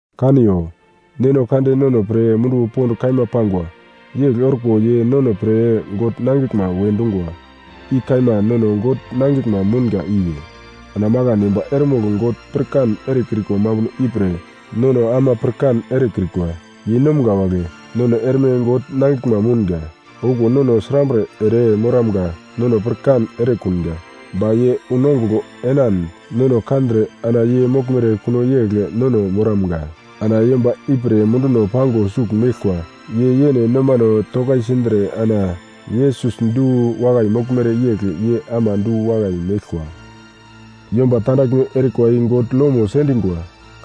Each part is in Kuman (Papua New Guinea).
Kaniyo! Neno Kande nono pre munduwo pond kaima pangwa. Yegl orko ye nono pre God nangiglma we dungwa, i kaima nono God nangiglma mounga iwe. Ana makan yomba eremogl God pirkan erekrikwa mambuno ipre, nono ama pirkan erekrikwa. Yeinomga wagle, nono erme God nangiglma mounga. Okuwo nono srambre ere moramga nono pirkan erekunga, ba ye unongugl enan nono kandre ana ye moglmere kuno yegl nono moramga. Ana yomba ipre munduno pango sugl meglkwa, ye yene nomano tokaisindre ana Yesus du-wakai moglmere yegl ye ama du-wakai meglkwa. Yomba tandaglme erikwa i God lomo sendingwa.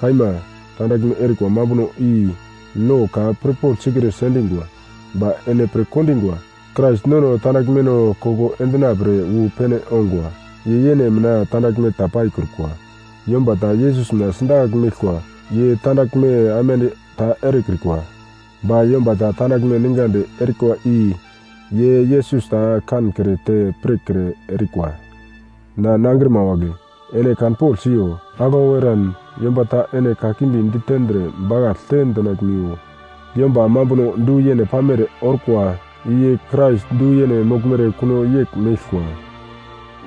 Kaima, tandaglme erikwa mambuno i lo ka pirpogl sikre sendingwa. Ba ene pirkondingwa, Krais nono tandaglmeno koko endina pre wu pene ongwa. Ye yene mina tandaglme ta paikrukwa. Yomba ta Yesus mina sidakagl meglkwa, ye tandaglme aimande ta erekrikwa. Ba yomba ta tandaglme ningadi erikwa i ye Yesus ta kankre te pirkre erikwa. Na nangrima wagle, ene kanpogl siyo. Aglau eran yomba ta ene kakimbi ditendre bakaglte dinaglmiwo. Yomba mambuno du-yene pamere orkwa, i ye Krais du-yene moglmere kuno yegl meglkwa.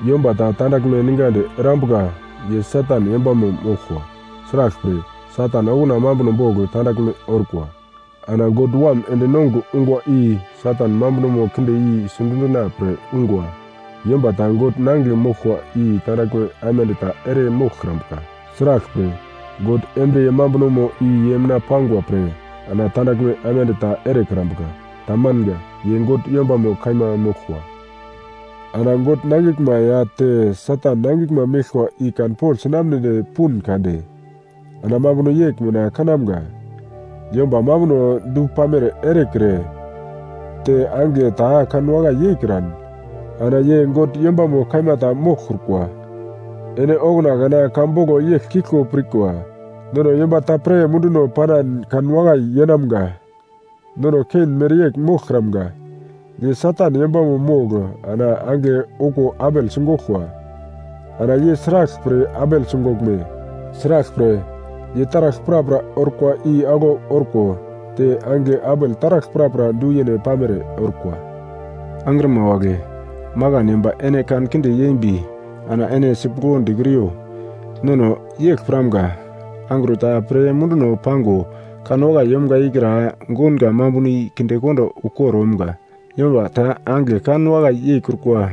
Yomba ta tandaglme ningadi erambuka ye Satan yombamo moglkwa. Sraglpre, Satan okuna mambuno bogl tandaglme orkwa. Ana God Wam ende nongugl ungwa i Satan mambunomo kinde i sidundina pre ungwa. Yomba ta God nangigle moglkwa i tandaglme aimande ta ere moglkrambuka. Sraglpre, God embriye mambunomo i ye mina pangwa pre ana tandaglme aimande ta erekrambuka. Tamanga; ye God yombamo kaima moglkwa. Ana God nangiglma ya te Satan nangiglma meglkwa i kanpogl sinamnedi pun kade ana mambuno yegl mina kanamga: Yomba mambuno du-pamere erekre te angigle ta kanwakai yeikran, ana ye God yombamo kaima ta moglkrukwa. Ene okuna kana ka boglo yegl kiglko pirkwa: Nono yomba ta pre munduno panan kanwakai yeinamga. Nono Kein mereyegl moglkramga. Ye Satan yombamo mogl ana angigle okuwo Abel sigoglkwa. Ana ye sraglpre Abel sigoglme? Sraglpre, ye taragl prapra orkwa i aglau orko te angigle Abel taragl prapra du-yene pamere orkwa. Angrima wagle, makan yomba ene kankinde yembi ana ene sipuglo dikriyo. Nono yegl piramga, angro ta pre munduno pango kanwakai yomga ikra gounga mambuno i kindekondo ukor omga. Yomba ta angigle kan wakai yeikrukwa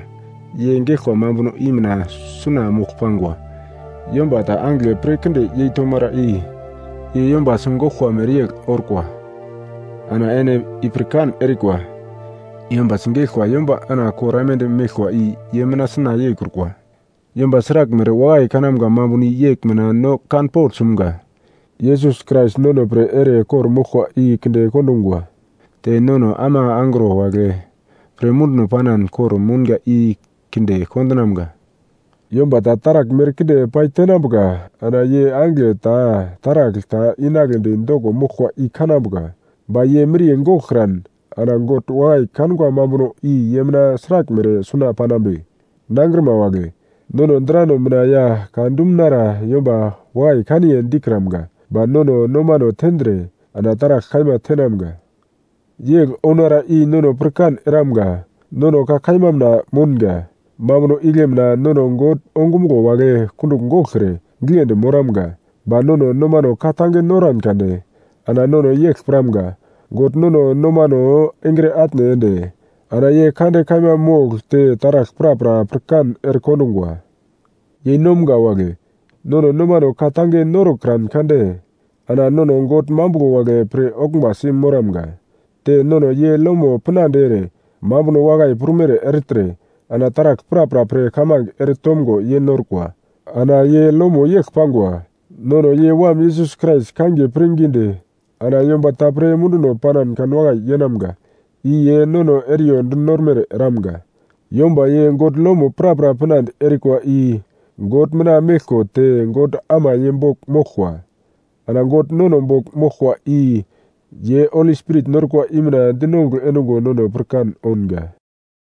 ye geglkwa mambuno i mina suna mogl pangwa. Yomba ta angigle pir kinde yei tomara, i ye yomba sigoglkwa mereyegl orkwa. Ana ene i pirkan erikwa, yomba sigeglkwa yomba ana kor aimande meglkwa i ye mina suna yeikrukwa. Yomba sraglmere wakai kanamga mambuno i yegl mina no kanpogl sumga: Yesus Krais nono pre ere kor-moglkwa i kinde kondungwa, te nono ama angro wagle pre munduno panan kor-mounga i kinde kondinamga. Yomba ta taragl merkinde paitenambuka ana ye angigle ta taragl ta inagledi doko moglkwa i kanambuka, ba ye miriye goglkran ana God wakai kangwa mambuno i ye mina sraglmere suna panambe? Nangrima wagle, nono drano mina ya ka dumunara yomba wakai kaniye dikramga ba nono nomano tendre ana taragl kaima tenamga. Yegl ounara i nono pirkan eramga, nono ka kaima mina mounga. Mambuno igle mina nono God ongumuglo wagle kundugl goglkre giglendi moramga. Ba nono nomano ka-tange noran kade ana nono yegl piramga: God nono nomano engre atne ende ana ye kande kaima mogl te taragl prapra pirkan erekondungwa. Yeinomga wagle, nono nomano ka-tange norokran kade ana nono God mambuglo wagle pir-oglmbasi moramga. Te nono ye lomo pinande ere, mambuno wakai prumere ertre ana taragl prapra pre kamange eretomgo ye norkwa. Ana ye lomo yegl pangwa: Nono ye Wam Yesus Krais kangiye pirngidi ana yomba ta pre munduno panan kanwakai yeinamga, i ye nono eriyo dinormere eramga. Yomba ye God lomo prapra pinande erikwa i God mina meglko te God ama ye bogl moglkwa. Ana God nono bogl moglkwa i ye Holi Spirit norkwa i mina dinongugl endungo nono pirkan ounga.